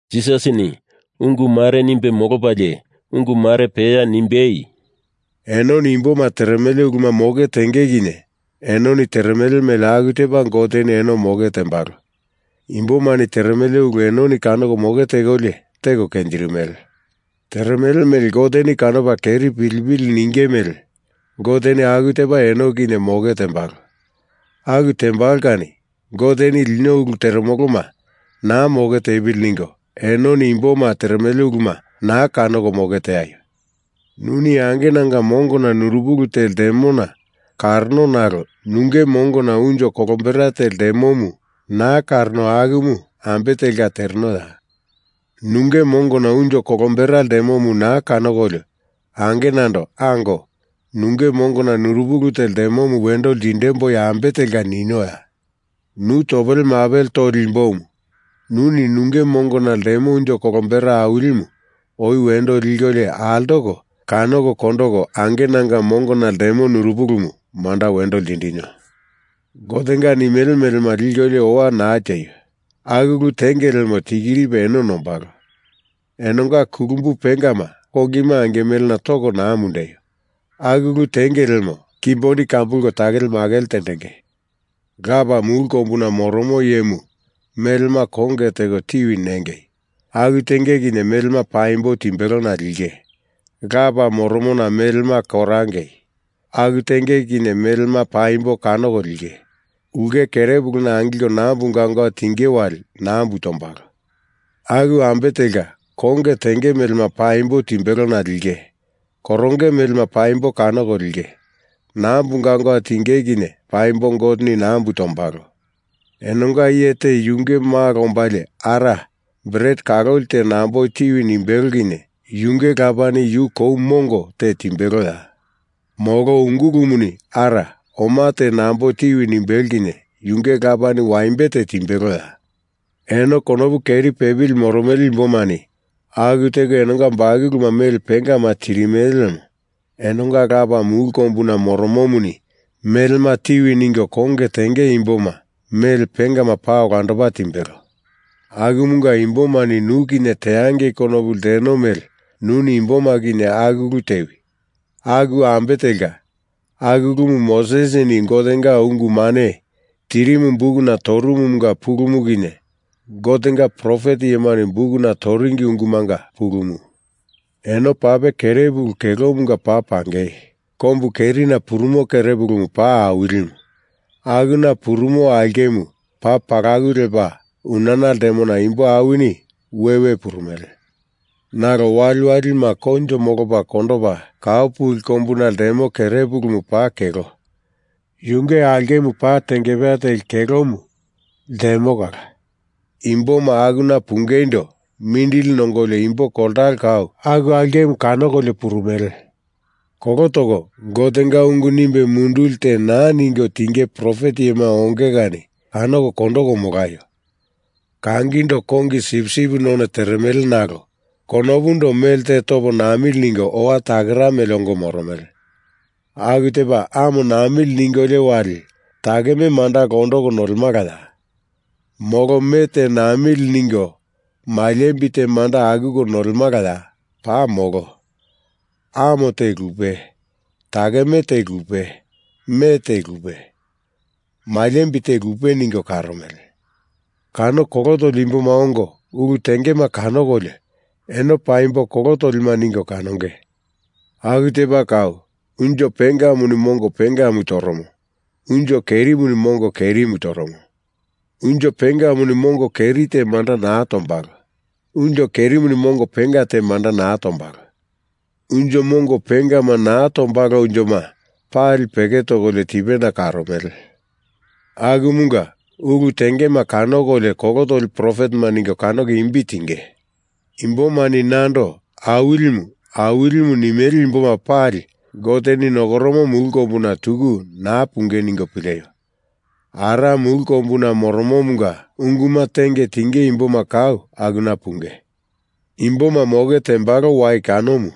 Jisasini ungu mare nimbe molopalie ungu mare peya nimbei, “Enoni imboma teremele uluma moke tenge kinye enoni teremele mele aku tepa Goteni eno moke tembalo. Imbomani teremele ulu enoni kanoko moke tekolio teko kenjirimele. Teremele mele Goteni kanopa keri pilipili ninge mele Goteni aku tepa eno kinye moke tembalo. Aku tembalo kani Goteni lino ulu teremoloma naa moke tepili ningo enoni imboma teremele uluma naa kanoko moke teaio. Nuni angenanga mongona nurupili te ltemona kanorono nalo nunge mongona unjo kolombera te ltemomu naa kanorono akumu ambe telka terenoya? Nunge mongona unjo kolombera ltemomu naa kanokolio angenando ango, nunge mongona nurupili te ltemomu wendo lindemboi ambe telka ninoya? Nu topele mapele toli imbomu, nuni nunge mongona ltemo unjo kolombera awilimu oi wendo likolio altoko kanoko kondoko angenanga mongona ltemo nurupilimu manda wendo lindinio. Gotenga nimele melema likolio owa naa tieio. Aku ulu tenge lemo tikiripe eno nombalo. Enonga kulumbu pengama kongima angimelena toko naa mundeio. Aku ulu tenge lemo kimboni kambulko takele makele tendenge. Lapa, mulu kombuna moromo iyemu melema konge teko tiwi nengei. Aku tenge kinye melema paimbo timbelona linge. Lapa moromona melema korangei. Aku tenge kinye melema paimbo kanoko linge. Ulke kerepuluna angilko nambu gaungau tinge wali nambu tombalo. Aku ambe telka konge tenge melema paimbo timbelona linge. Koronge melema paimbo kanoko linge. Nambu gaungau tinge kinye paimbo Goteni nambu tondombalo. Enonga iye te yunge malo ombalie Ara, bret kaloli te nambo tiwi nimbelo kinye yunge lapani yu kou mongo te timbeloya? Molo ungulumuni Ara, oma te nambo tiwi nimbelo kinye yunge lapani waimbe te timbeloya? Eno konopu keri pepili moromele imbomani aku teko enonga bakuluma mele pengama tirimele lemo enonga Lapa mulu kombuna moromomuni melema tiwi ningo konge tenge imboma mele pengama paa olandopa timbelo. Akumunga, imbomani nu kinye teangei konopu lteno mele nuni imboma kinye aku ulu tewi. Aku ambe telka, aku ulumu Mosesini Gotenga ungu mane tirimu bukuna torumumanga pulumu kinye, Gotenga profet iyemani bukuna toringi ungumanga pulumu. Eno pape kerepulu kelomunga paa pangei. Kombu kerina purumo kerepulumu paa awilimu, akuna purumo aulkemu paa palaku lepa unana ltemona imbo awinini we we purumele. Nalo waliwalima koinjo molopa kondopa kau puli kombuna ltemo kerepulumu paa kelo, yunge aulkemu paa tengepeya teli kelomu ltemo kala imboma akuna pungeindo mindili nongolio imbo koltalo kau aku aulkemu kanokolio purumele. Kolo toko Gotenga ungu nimbe munduli te naa ningo tinge profet iyema onge kani kanoko kondoko molaio. Kangindo kongi sipsip none teremele nalo konopundo melte topo namili ningo owa takera mele ongo moromele. Aku tepa amo namili ningolio wali takeme manda londoko nolemalaya? Molo me te namili ningo maliembi te manda akuko nolemalaya? Paa molo. Amo te lupe, takeme te lupe, me te lupe, maliembi te lupe ningo karomele. Kano kolo toli imboma ongo ulu tengema kanokolio, eno paimbo kolo tolima ningo kanonge. Aku tepa kau unjo pengamuni mongo pengamu toromo. Unjo kerimuni mongo kerimu toromo. Unjo pengamuni mongo keri te manda naa tombalo. Unjo kerimuni mongo penga te manda naa tombalo. Unjo mongo pengama naa tombalo unjoma pali peke tokolio tipena karomele. Akumunga ulu tengema kanokolio kolo toli profetema ningo kanoko imbi tinge. Imbomani nando Awilimu, Awilimu nimele imboma pali Goteni nokoromo mulu kombuna tuku naa punge ningo pileio. Ara mulu kombuna moromomunga unguma tenge tinge imboma kau akuna punge. Imboma moke tembalo wai kanomu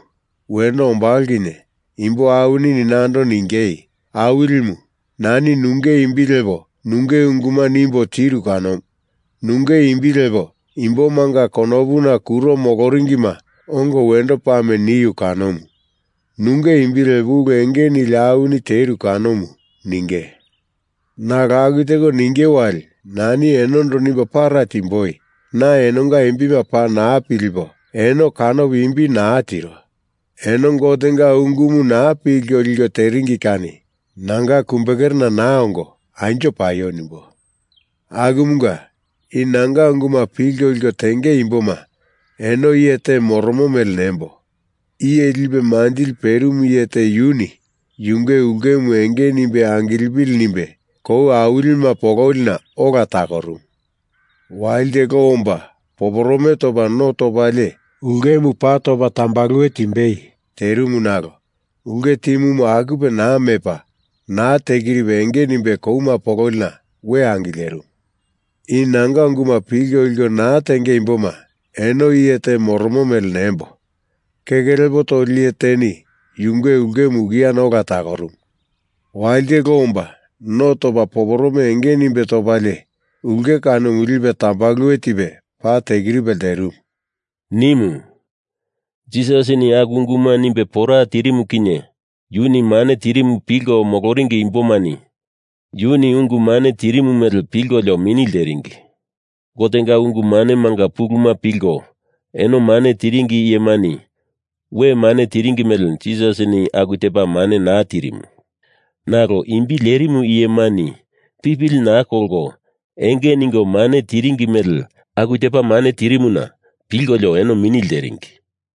wendo ombalo kinye imbo awinini nando ningei, ‘Awilimu, nani nunge imbi lepo nunge unguma nimbo tiru kanomu. Nunge imbi lepo imbomanga konopuna kuro moloringima ongo wendo pame niu kanomu. Nunge imbi lepo ulu enge nili awini teru kanomu,’ ninge. Nalo aku teko ninge wali nani enondo nimbo para timboi, ‘Na enonga imbima paa naa pilipo eno kanopo imbi naa tiro. Eno Gotenga ungumu naa pilko liko teringi kani nanga kumbekerena naa ongo anjo paio,’ nimbo. Akumunga, i nanga unguma pilko liko tenge imboma eno iye te moromo mele nembo. Iye lipe manjili perimu iye te yuni yunge ulkemu enge nimbe angilepili nimbe kou awilima pololina ola takorumu. Walite lo omba poporome topa no topalie ulkemu paa topa tambaluwe timbei terimu nalo ulke timumu akupe naa mepa naa tekiripe enge nimbe kouma pololina we angilerimu. I nanga unguma pilko liko naa tenge imboma eno iye te moromo mele nembo. Keke lepo toli iye teni yunge ulkemu ukiana ola takorumu. Walite lo omba no topa poporome enge nimbe topalie ulke kanomu lipe tambaluwe tipe paa tekiripe lterimu,” nimu. Jisasini aku unguma nimbe pora tirimu kinye yuni mane tirimu pilko moloringi imbomani yuni ungu mane tirimu mele pilkolio mini lteringi. Gotenga ungu manemanga puluma pilko eno mane tiringi iyemani we mane tiringi mele Jisasini aku tepa mane naa tirimu. Nalo imbi lerimu iyemani pipili naa kolko enge ningo mane tiringi mele aku tepa mane tirimuna pilkolio eno mini lteringi.